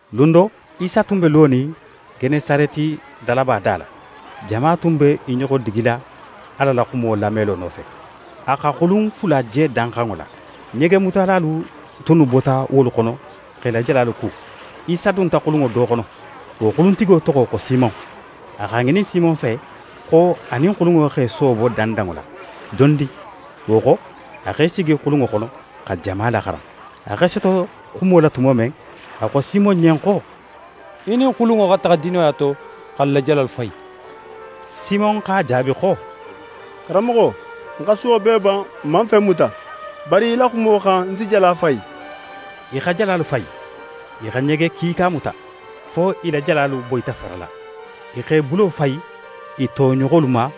Lun do, Isa tun be lonin Genesareti dalaba da la. Jama tun be i ɲoxo digila Ala la xumo lamelo nofe. A xa xulun fula je danxanŋo la. Ɲegemutalalu tunnu bota wolu xono x'e la jalalu ku. Isa dunta xulunŋo do xono, wo xuluntigo toxo xo Simon. A x'a ŋinin Simon fe xo a nin xulunŋo x'é soobo dandanŋo la dondin. Wo xo, a x'é sigi xulunŋo xono xa jama laxaran. A x'é soto xumo la tumo men, a xo Simon ɲen xo: «Í nin xulunŋo xa taxa dinoya to, x'alu la jalalu fayi.» Simon x'a jaabi xo: «Karanmoxo, n xa suwo bee ban, n man fen muta. Bari í la xumo xan, ń si jala fayi.» I xa jalalu fayi, i xa ɲege kiika muta, fo i la jalalu boyita farala. I x'e bulo fayi i toɲoxolu ma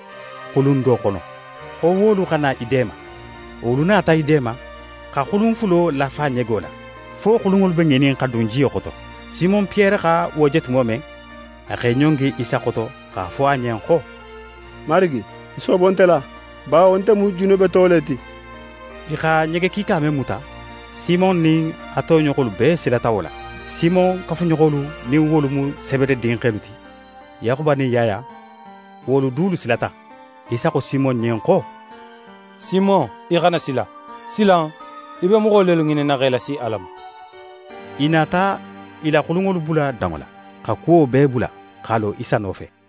xulun do xono, xo wolu xa na i deema. Wolu nata i deema, xa xulun fulo lafa ɲego la, fo xulunŋolu be ŋinin xa dun jiyo xoto. Simon Piyere xa wo je tumo men, a x'é ɲongi Isa xoto x'a fo a ɲen xo: «Marigi, í soobo nte la, bawo nte mu junubeto le ti.» I xa ɲege kiika men muta, Simon nin a toɲoxolu bee silata wo la. Simon kafuɲoxolu, nin wolu mu Sebede dinxelu ti, Yaxuba nin Yaya, wolu dulu silata. Isa xo Simon ɲen xo: «Simon, í xana sila. Silan, í be moxo lelu ŋininna x'e lasi Ala ma.» I nata i la xulunŋolu bula danŋo la, xa kuwo bee bula, x'a lo Isa nofe.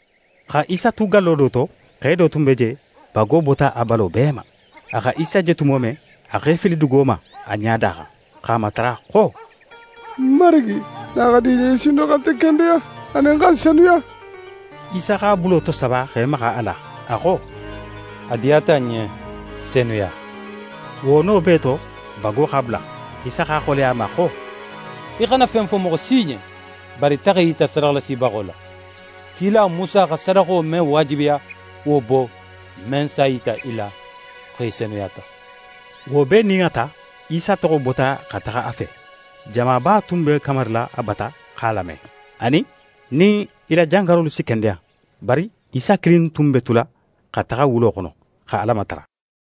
Xa Isa tu gallo do to, xe do tun be je, bago bota a balo bee ma. A xa Isa je tumo men, a x'é fili dugo ma a ɲada xan, x'a matara xo: «Marigi, nin a xa di í ɲen, í si sin no xa nte kendeya, anin xa ń senuya.» Isa x'a bulo tosaba x'é maxa a la. A xo: «A diyata ń ɲen, senuya!» Wo no bee to, bago x'a bula. Isa x'a xoleya a ma xo: «Í xana fen fo moxo si ɲen, bari taxa í yita sadaxalasibaxo la. Kila Musa xa sadaxo men waajibiya, wo bo, men s'a yita i la xo í senuyata.» Wo bee nin a ta, Isa toxo bota xa taxa a fe. Jamaba tun be kamarila a bata x'a lame, anin, nin i la jangarolu si kendeya. Bari Isa kilin tun be tula xa taxa wulo xono, xa Ala matara.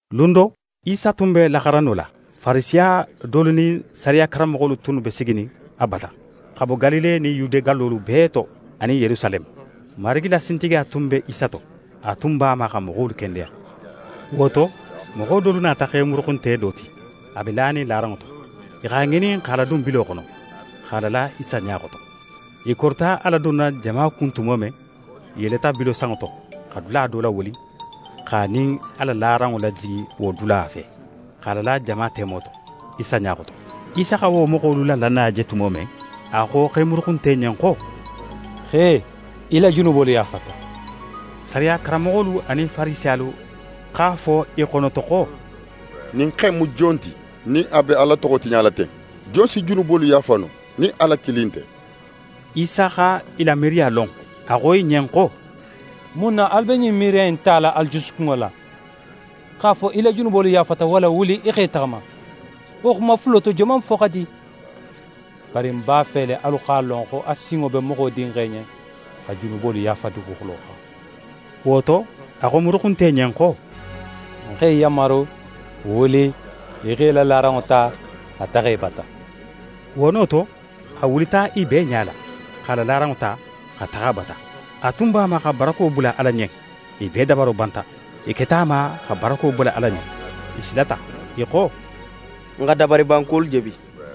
Lun do, Isa tun be laxaranno la. Farisiya dolu nin sariya karanmoxolu tunnu be siginin a bata, xa bo Galile nin Yude gallolu bee to anin Yerusaleme. Marigi la sintigiya tun be Isa to. A tun b'a ma xa moxolu kendeya. Wo to, moxo dolu nata xe muruxunte do ti, a be lanin laranŋo to. I x'a ŋinin x'a ladun bilo xono, x'a lala Isa ɲa xoto. I korita a ladunna jama kun tumo men, i yeleta bilo sanŋo to, xa dula do lawuli, x'a nin a la laranŋo lajigi wo dula fe, x'a lala jama temo to, Isa ɲa xoto. Isa xa wo moxolu la lannaya je tumo men, a xo xe muruxunte ɲen xo: «Xe, í la junubolu yaafata.» Sariya karanmoxolu anin Farisiyalu x'a fo i xonoto xo: «Ɲin xe in mu jon ti, nin a be Ala toxo tiɲala ten? Jon si junubolu yaafa no, nin Ala kilin nte?» Isa xa i la miiriya lon, a xo i ɲen xo: «Mun na alu be ɲin miiriya in tala alu jusukunŋo la? X'a fo: “Í la junubolu yaafata”, walla: “Wuli, í x'é taxama.” Wo xuma fulo to, joman fo xa di? Bari ń b'a fe le alu x'a lon xo a sinŋo be Moxo Dinxe ɲen xa junubolu yaafa duguxulo xan». Wo to, a xo muruxunte ɲen xo: «Ń x'é yanmaru, wuli, í x'é la laranŋo ta, xa taxa í bata!» Wo no to, a wulita i bee ɲala, x'a la laranŋo ta, xa taxa a bata. A tun b'a ma xa barako bula Ala ɲen. I bee dabaro banta, i keta a ma xa barako bula Ala ɲen. I silata, i xo: «N xa dabariban kuwolu je bi.»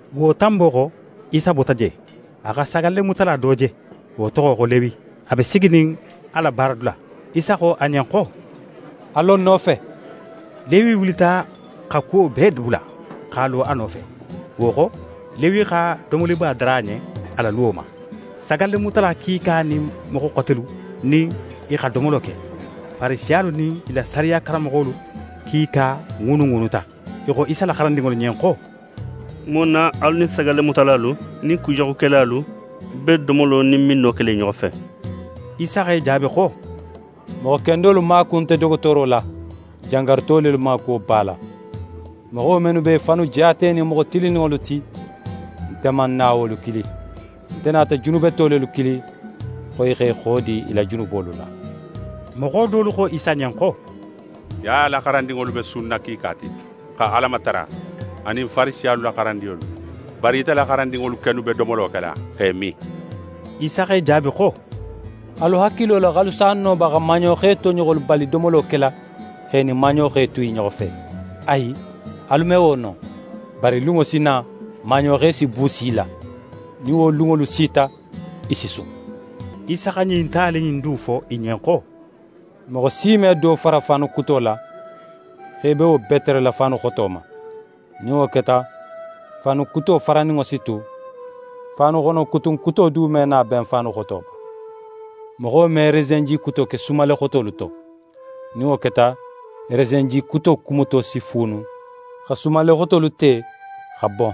Wo tanbo xo, Isa bota je, a xa sagallemutala do je, wo toxo xo Lewi, a be siginin a la baaradula. Isa xo a ɲen xo: «A lo ń nofe.» Lewi wulita xa kuwo bee bula, x'a lo a nofe. Wo xo, Lewi xa domoliba dara a ɲen a la luwo ma. Sagallemutala kiika nin moxo xotelu nin i xa domolo ke. Farisiyalu nin i la sariya karanmoxolu kiika ŋuunuŋuunuta; i xo Isa la xarandinŋolu ɲen xo: «Mun na alu nin sagallemutalalu nin kujaxukelalu be domolo nin minno kela i ɲoxo fe?» Isa x'e jaabi xo: «Moxo kendolu maaku nte dogotooro la, jangaruto lelu maakuwo b'a la. Moxo mennu be i fannu jaatenin moxo tilinninŋolu ti, nte man na wolu kili; nte nata junubeto lelu kili, xo i x'e xodi i la junubolu la.» Moxo dolu xo Isa ɲen xo: «Yaya la xarandinŋolu be sunna kiika ti, xa Ala matara, anin Farisiyalu la xarandinŋolu; bari ite la xarandinŋolu kennu be domolo kela, x'e min.» Isa x'e jaabi xo: «Alu hakilo la x'alu s'a no ba xa maaɲoxe toɲoxolu bali domolo kela, x'e nin maaɲoxe tu i ɲoxo fe? Ayi, alu me wo no! Bari lunŋo si na, maaɲoxe si buusi i la, nin wo lunŋolu sita, i si sun.» Isa xa ɲin tali in du fo i ɲen xo: «Moxo si me do fara faanu kuto la, x'é be wo beterela faanu xoto ma. Nin wo keta, faanu kuto faraninŋo si tu, faanuxonokutun kuto du me na ben faanu xoto ma. Moxo me resenji kuto ke sumalle xotolu to. Nin wo keta, resenji kuto kumuto si fuunu, xa sumalle xotolu te, xa bon.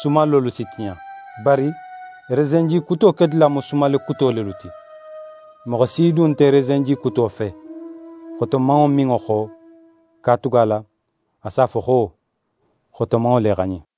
Sumallolu si tiɲa. Bari resenji kuto kedula mu sumalle kuto lelu ti. Moxo si du nte resenji kuto fe, xotomanŋo minŋo xo, katugala a s'a fo xo: “Xotomanŋo le xa ɲin.”»